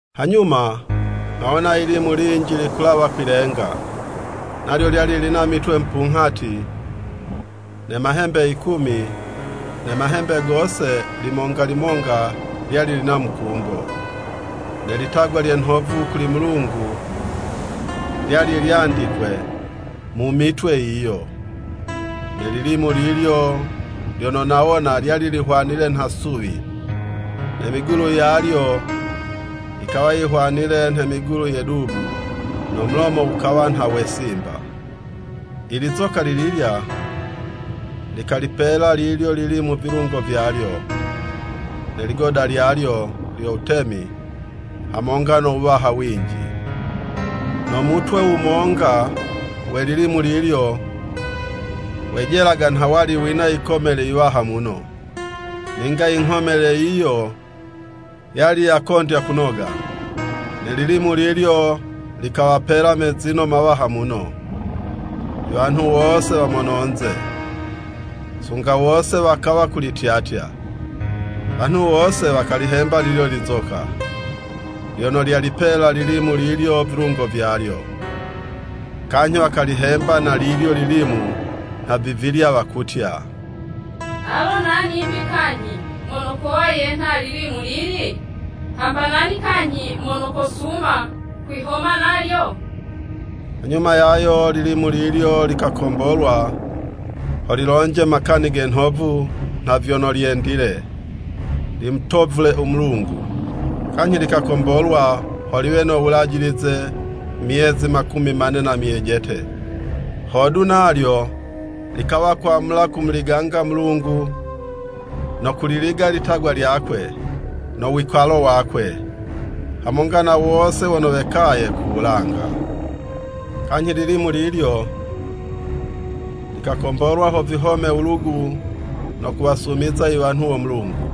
Hanyuma, nghawona yilimu linji likulawa kwi'lenga. Nalyo lyali lina mitwe mupunghati ne mahembe yikumi, ne mahembe gose limonga limonga, lyali lina mukumbo. Ne litagwa lye nhovu kuli Mulungu, lyali lyandikwe mu mitwe yiyo. Ne lilimu lilyo lyono nawona, lyali lihwanile nha suwi, ne migulu yalyo yikawa yihwanile nhe migulu ye dubu, no mulomo wukawa nha we simba. I lizoka li lilya, likalipela lilyo lilimu vilungo vyalyo, ne ligoda lyalyo lyo wutemi, hamonga no wuwaha winji. No mutwe wumonga we lilimu lilyo, wejelaga nha wali wina yikomele yiwaha muno, ninga i nghomele yiyo yali yakondya kunoga. Ne lilimu lilyo likawapela mezino mawaha muno, i wanhu wose wa mono'nze, sunga wose wakawa kulityatya. Wanhu wose wakalihemba lilyo lizoka, vyono lyalipela lilimu lilyo vilungo vyalyo. Kanyhi wakalihemba na lilyo lilimu nha vivilya wakutya, “Alo nani'mbi kanyhi mono kowa yenha ililimu lili? Hamba nani kanyhi mono kosuma kwihoma nalyo?” Hanyuma yayo lilimu lilyo likakombolwa ho lilonje makani ge nhovu nha vyono lyendile, limutovule u Mulungu, kanyhi likakombolwa ho liwe no wulajilize, myezi makumi mane na myejete. Hodu, nalyo likawa kwamula kumuliganga Mulungu, no kuliliga litagwa lyakwe, no wikalo wakwe, hamonga na wose wono wekaye ku wulanga. Kanyhi lilimu lilyo, likakombolwa ho vihome wulugu no kuwasumiza i wanhu wo Mulungu.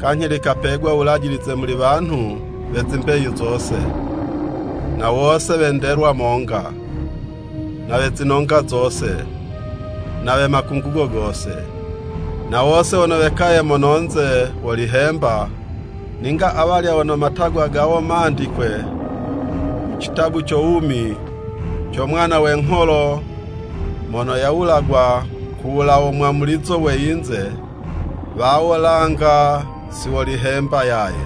Kanyhi likapegwa wulajilize muli wanhu we zimbeyu zose, na wose we ndelwa monga, na we zinonga zose, na we makungugo gose. Na wose wono wekaye mono'nze wolihemba, ninga awalya wono matagwa gawo mandikwe mu citabu co wumi co Mwana we ngholo, mono yawulagwa ku wulawo mwamulizo we yinze, wawo langa si wolihemba yaye.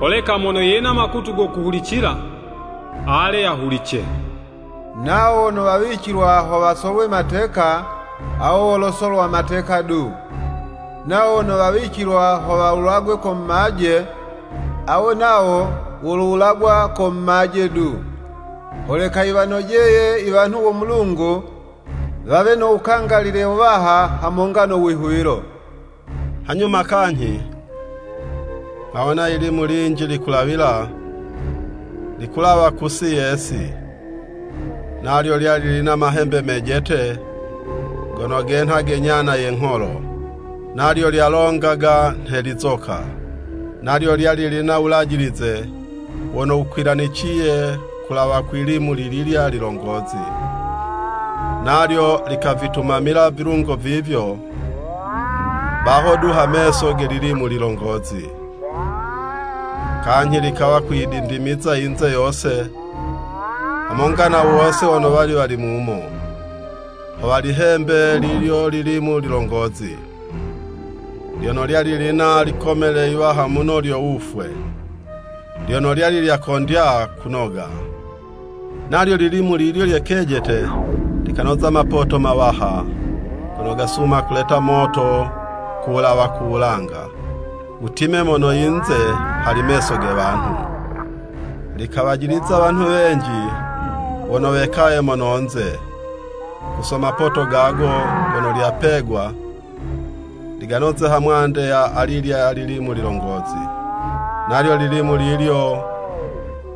“Holeka mono yena makutu go kuhulicila, ale yahulice! Nawo wono wawicilwa ho wasolwe mateka, awo wolosolwa mateka du, nawo wono wawicilwa ho wawulagwe ko mumaje, awo nawo wolowulagwa ko mumaje du. Holeka yiwanojeye i wanhu wo Mulungu, wawe no wukangalile wuwaha hamonga no wihuwilo.” Hanyuma kanyhi, nghawona yilimu linji likulawila, likulawa kusi ye'si. Nalyo lyali lina mahembe mejete, gono genha ge nyana ye ngholo, nalyo lyalongaga nhe lizoka. Nalyo lyali lina wulajilize wono wukwilaniciye ku wulawa kwi 'limu lililya lilongozi, nalyo likavitumamila vilungo vivyo, baho du ha meso ge lilimu lilongozi. Kanyhi likawa kuyidindimiza yinze yose, hamonga na wose wono wali mumo, ho walihembe lilyo lilimu lilongozi, lyono lyali lina likomele yiwaha muno lyo wufwe, lyono lyali lyakondya kunoga. Nalyo lilimu lilyo lye kejete likanoza mapoto mawaha, gono gasuma kuleta moto ku wulawa ku wulanga, wutime mono yinze hali meso ge wanhu. Likawajiliza wanhu wenji wono wekaye mono'nze, ku so mapoto gago gono lyapegwa liganoze ha mwande ya alilya lilimu lilongozi. Nalyo lilimu lilyo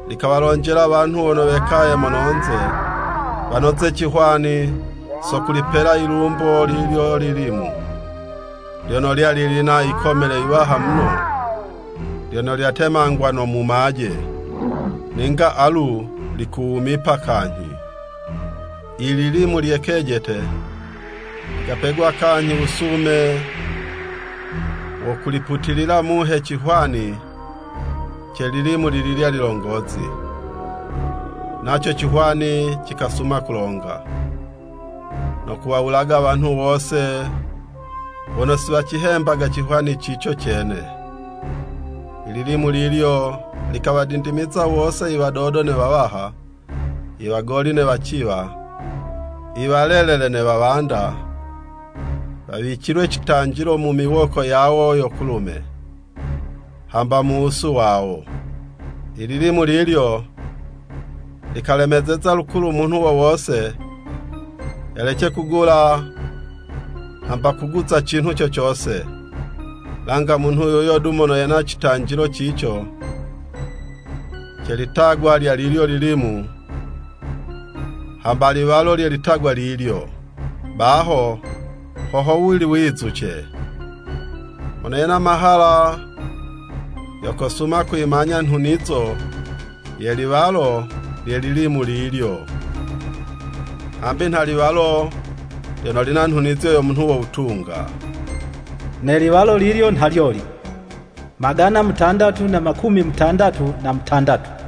likawalonjela wanhu wono wekaye mononze, wanoze cihwani, so kulipela yilumbo lilyo lilimu, lyono lyali lina likomele yiwaha muno, lyono lyatemangwa no mumaje, ninga alu likuwumipa kanyhi. I lilimu lye kejete, likapegwa kanyhi wusume wo kuliputilila muhe cihwani ce lilimu lililya lilongozi, naco cihwani cikasuma kulonga, no kuwawulaga wanhu wose wono si wacihemba cihwani cico cene. I lilimu lilyo likawadindimiza wose, i wadodo ne wawaha, i wagoli ne waciwa, i walelele ne wawanda, wawicilwe citanjilo mu miwoko yawo yo kulume, hamba mu wusu wawo. I lilimu lilyo, likalemezeza lukulu munhu wo wose, yalece kugula hamba kuguza cinhu co cose, langa munhu yuyo du mono yena citanjilo cico, ce litagwa lya lilyo lilimu, hamba liwalo lye litagwa lilyo. Baho ho howuli wizuce! Mono yena mahala, yo kosuma kuyimanya nhunizo ye liwalo lye lilimu lilyo, hambi nha liwalo lyono lina nhunizo yo munhu wo wutunga. Ne liwalo lilyo nha lyoli, magana mutandatu na makumi mutandatu na mutandatu.